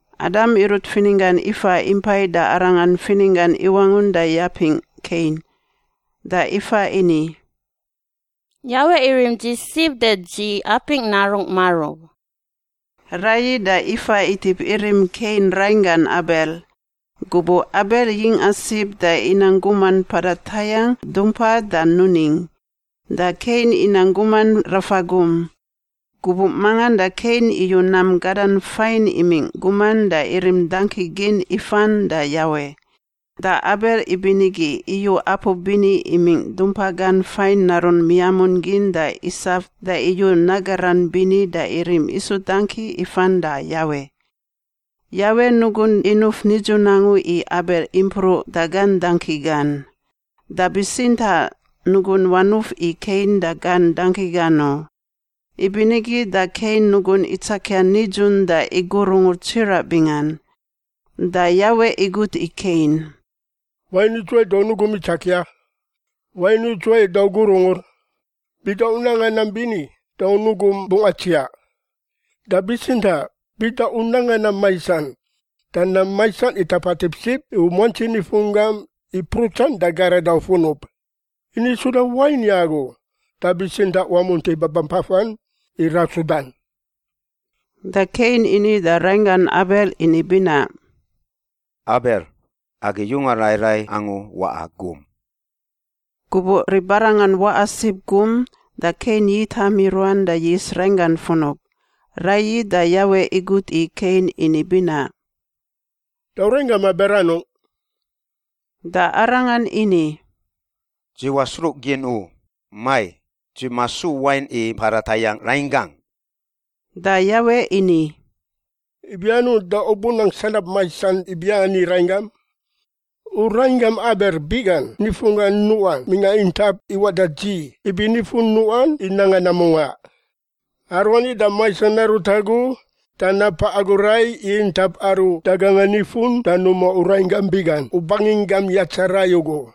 Adam irut fininggan Ifa impai da arangan fininggan iwangun da yapingꞌ Kein. Da Ifa ini, “Yawe irim dzi sib da dzi yapingꞌ narungꞌ marub.” Raiyi da Ifa itip irim Kein rainggan Abel. Gubuꞌ Abel yingꞌa sib da inang guman mpada tayangꞌ dumpa da nuning, da Kein inang guman rafa gum. Gubuꞌ mangan da Kein iyu nam gadan fain imingꞌ guman da irim dangki gin ifan da Yawe. Da Abel ibinigi iyu apu bini imingꞌ dumpa gan fain narun miamun gin da isaf da iyu nagaran bini da irim isu dangki ifan da Yawe. Yawe nugun inuf nidzun angu i Abel impruꞌ da gan dangki gan, da bitsintaꞌ nugun wanuf i Kein da gan dangki gan u. Ibinigi da Kein nugun itsakia nidzun da igurungur tsiraꞌ bingan. Da Yawe igut i Kein, “Wain idzuwai da u nugum itsakia? Wain idzuwai da u gurungur? Bida u nanga nam bini da u nugum bungꞌ atsiaꞌ. Da bitsintaꞌ bida u nanga nam maisan da nam maisan itapatip sib u muantsi nifunggam i prutsan da garada u funub. Ini suda wain i agu, da bitsintaꞌ wamunti babampafan i rasudan.” Da Kein ini da rainggan Abel ini binaꞌ, “Abel, agi yunga rai rai angu waꞌa gum.” Gubuꞌ ribarangan waꞌa sib gum, da Kein yitam i ruan da yis rainggan funub. Raiyi da Yawe igut i Kein ini binaꞌ, “Da u rainggam Abel anungꞌ?” Da arangan ini, “Dzi wasruꞌgin u. Mai! Dzi masu wain i mpada tayangꞌ rainggangꞌ?” Da Yawe ini, “Ibi anungꞌ da u bunang sanab maisan ibiani i rainggam? U rainggam Abel biꞌgan nifunggan nuꞌan mingꞌa intap iwaꞌ da dzi ibi nifun nuꞌan i nanga nam mungaꞌ. Aruani da maisan narut agu da napaꞌ agu rai i intap aru daganga nifun da numa u rainggam biꞌgan u banginggam yatsa rai ugu.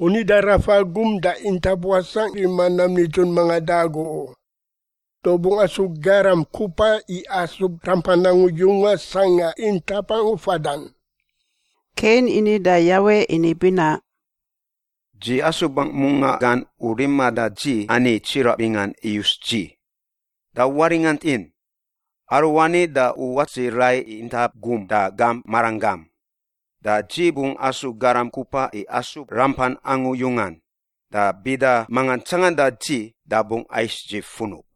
U nida rafa gum da intap wasangꞌ i rima nam nidzun mangan da agu u. Da u bungꞌ asu garam kupa i asub rampan angu yungan sangꞌa intap angu fadan.” Kein ini da Yawe ini binaꞌ, “Dzi asubangꞌ mungaꞌ gan u riman da dzi ani tsiraꞌ bingan iyus dzi. Da waringantin! Aruani da u wat dzi rai i intap gum da gam maranggam. Da dzi bungꞌ asu garam kupa i asub rampan angu yungan, da bida manga tsanganda dzi da bungꞌ ais dzi funub.”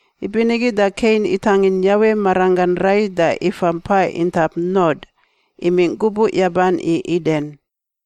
Ibinigi da Kein itangin Yawe maranggan rai da ifa mpa intap Nod imingꞌ gubuꞌ yaban i Iden.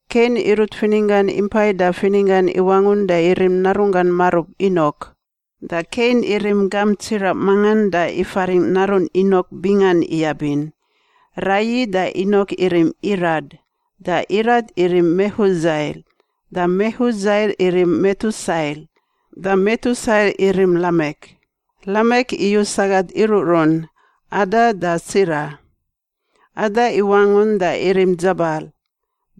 Kein irut fininggan impai da fininggan iwangun da irim narunggan marub Inok. Da Kein irim gamp tsiraꞌ mangan da ifaringꞌ narun Inok bingan iyabin. Raiyi da Inok irim Irad. Da Irad irim Mehudzael. Da Mehudzael irim Metusael. Da Metusael irim Lamek. Lamek iyu sagat iruꞌrun, Ada da Tsila. Ada iwangun da irim Dzabal.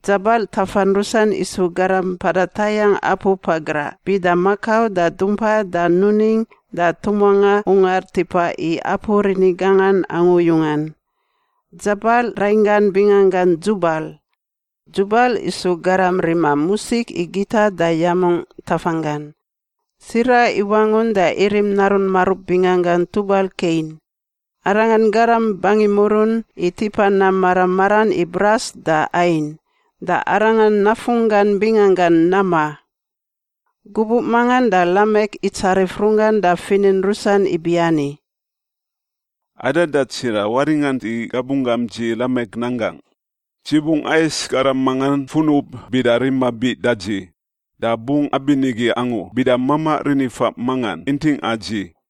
Dzabal tafan rusan isu garam mpada tayangꞌ apu pagraꞌ bida makau da dumpa da nuning da tumuangꞌa ungar tipa i apu rini gangan angu yungan. Dzabal rainggan binganggan Dzubal. Dzubal isu garam rima musik i gita da yamungꞌ tafanggan. Tsila iwangun da irim narun marub binganggan Tubal Kein. Arangan garam bangimurun i tipa nam mara maran i bras da ain. Da arangan nafunggan binganggan Nama. Gubuꞌ mangan da Lamek itsarif runggan da finin rusan ibiani, “Ada da Tsila, waringant i gabunggam dzi, Lamek, nan gangꞌ! Dzi bungꞌ ais garam mangan funub bida rima biꞌ da dzi. Da bungꞌ abinigi angu bida mamaꞌ rinifaꞌ mangan intingꞌa dzi.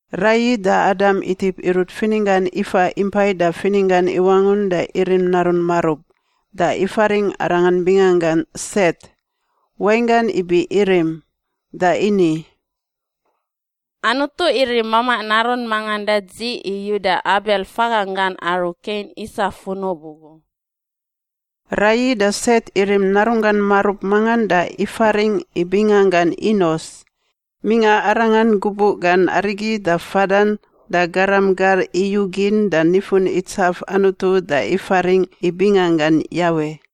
Raiyi da Adam itip irut fininggan Ifa impai da fininggan iwangun da irim narun marub, da ifaringꞌ arangan binganggan Set (wainggan ibi irim) da ini, “Anutu irim mamaꞌ narun mangan da dzi i uda Abel faganggan aru Kein isa funub ugu.” Raiyi da Set irim narunggan marub mangan da ifaringꞌ i binganggan Inos. Mingꞌa arangan gubuꞌ gan arigi da fadan da garam gar iyugin da nifun itsaf Anutu da ifaringꞌ i binganggan Yawe.